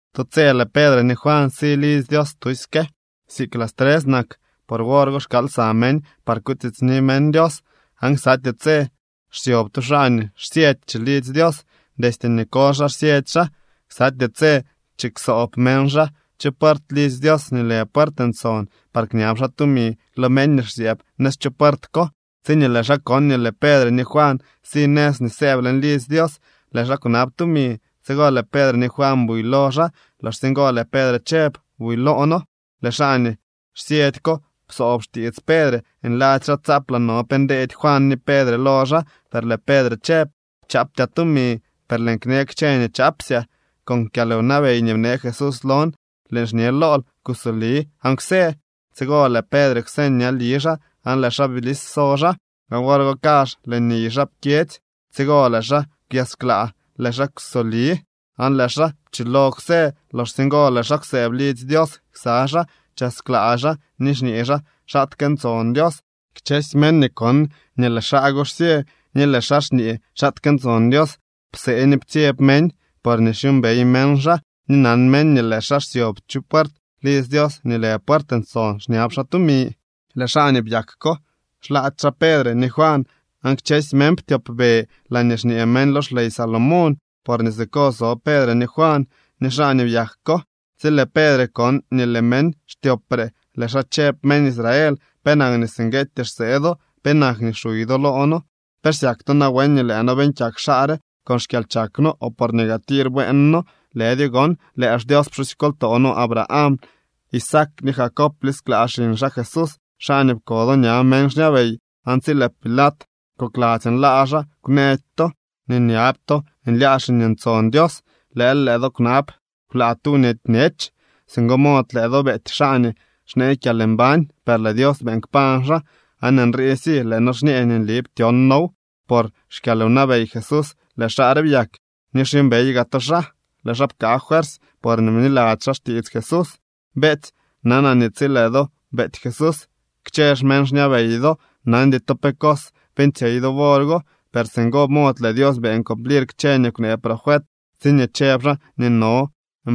Tu tse lëë Pedre ni Juan si lidzy Dios tusyke. Siik las tres nak, por wor go xkaal lsa meñ par kutiitsni meñ Dios. Aan ksatyee tse xsyob tu xaa nii xsyëdy chilidzy Dios. Destye nii koly xaa xsyëdy xaa. Ksatyee tse chiksoob meñ xaa chu puert lidzy Dios nii lë Puert Ntson par kñab xaa tumi lo meñ nii xsyëëb nëz chu puert ko. Tsiñee lëë xaa kon nii lëë Pedre ni Juan si nëz nii sëëb leñ lidzy Dios, lëë xaa kwnab tumi. Tsigo lëë Pedre ni Juan buy lo xaa. Loxsye ngo lëë Pedre chëb: —Buy loo noo. Lëë xaa nii xsyëdy ko psoob xtiits Pedre, nladzy xaa tsaaplaa no pe ndeedy Juan ni Pedre lo xaa. Per lëë Pedre chëb: —Chaaptyaa tumi, per lëën kne kchë nii chaapsyaa. Con kyalwnabey nii bnee Jesús lon lëën xñe lool: Kusoli aan kwsë. Tsigo lëë Pedre kwseñ ñali xaa aan lëë xaa blis so xaa, aan wor go kazh lëë niy xaa pkyedzy. Tsigo lëë xaa kwyasklaa, lëë xaa kwsoli, aan lëë xaa pchilo kwsë. Loxsye ngo lëë xaa kwsëëb lidzy Dios ksa xaa, chasklaa xaa ni xñee xaa xaatke ntson Dios. Kchësy meñ nii kon nii lëë xaa go xsyë ni lëë xaa xñee xaatke ntson Dios psee ni ptsyeb meñ, porñee xyuumbey meñ xaa, ni nan meñ nii lëë xaa xsyob chu puert lidzy Dios nii lë Puert Ntson xñab xaa tumi. Lëë xaa nii byak ko xlaady xaa Pedre ni Juan, aan kchësy meñ ptyopbe laañee xñee meñ lo xley Salomón, porñee siko so Pedre ni Juan ni xaa nii byak ko. Tsi lëë Pedre kon nii lëë meñ xtyopre, lëë xaa chëb: —Meñ Israel, ¿penak nii singueetyee xsee do? ¿Penak nii xuy do loo noo? ¿Pe xsyak to nawen nii lëë noo beeñ kyak xaa re con xkyalchak no o porñee gaa tir tir bueen noo? Lëdyo gon, lëë xDios pxusykoltoo no Abraham, Isaac ni Jacob blisklaa xiñ xaa Jesús, xaa nii pko do ña meñ xñabey. Aan tsi lëë Pilat kokladzy nlaa xaa, kwnëdy to. Ni nyab to nlyaa Xiñ Ntson Dios, lëël lëë do kwnab kwlaa tu nweety bñech. Singo mod lëë do beety xaa nii xnee kyalmbañ. Per lëë Dios beeñ kpañ xaa, aan nriisy lëë noo xñee nii nli ptyon noow. Por xkyalwnabey Jesús lëë xaa re byak ni xyuumbey gaa to xaa. Lëë xaa pkaa fuersy porñee bniladzy xaa xtiits Jesús. ’Beetsy, nanaa nii tsi lëë do beety Jesús kchë xmeñ xñabey do, nandy to pe cos beeñtsyey do wor go. Per singo mod lëë Dios beeñ cumplir kchë nii kwnee profet tsiñee chëb xaa nii no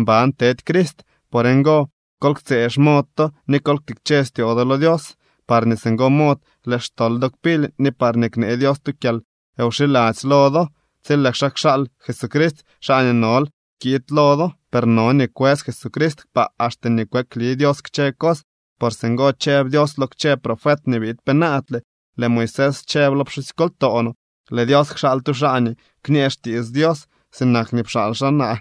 mban tedy Crist. Por ngo, kol ktsëë xmod to ni kol ktikche styoo do lo Dios, parñee singo mod lëë xtol do kpily ni parñee knee Dios tu kyalwxiladzy lo do tsi lëë xaa kxaal Jesucrist, xaa nii nol kiid lo do. Per no nii kwës Jesucrist kpaa axte nii kweekli Dios kchë cos. Por singo chëb Dios lo kchë profet nii biid penaadle. Lëë Moisés chëb lo pxusykoltoo no: “Lëë Dios kxaal tu xaa nii kñee xtiits Dios. Sinak nii pxaal xaa naa,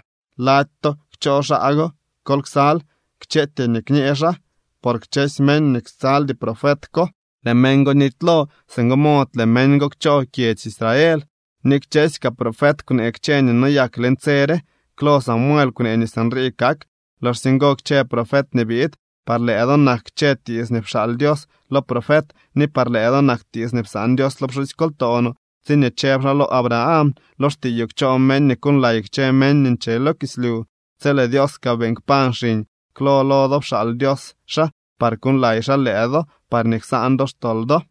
lady to kchoo xaa go. Kol ksal kchëëtyee nii kñë xaa, por kchësy meñ nii ksaldy profet ko, lëë meñ go nitylo. Singo mod lëë meñ go kchoo kyedzy Israel.” ’Ni kchësy kaa profet kwnee kchë nii noyak leñ tse re. Klo Samuel kwnee nii sinrii kak, loxsye ngo kchë profet nii biid. Par lëë do nak kchë tiits nii pxaal Dios lo profet ni par lëë do nak tiits nii psaan Dios lo pxusykoltoo no tsiñee chëb xaa lo Abraham: “Lo xtiiyoo kchoo meñ nii kuuñlay kchë meñ nii nche lo kislyu.” Tsi lëë Dios kaa beeñ kpañ xiñ, klo lo do pxaal Dios xaa par kuuñlay xaa lëë do, parñee ksaan do xtol do.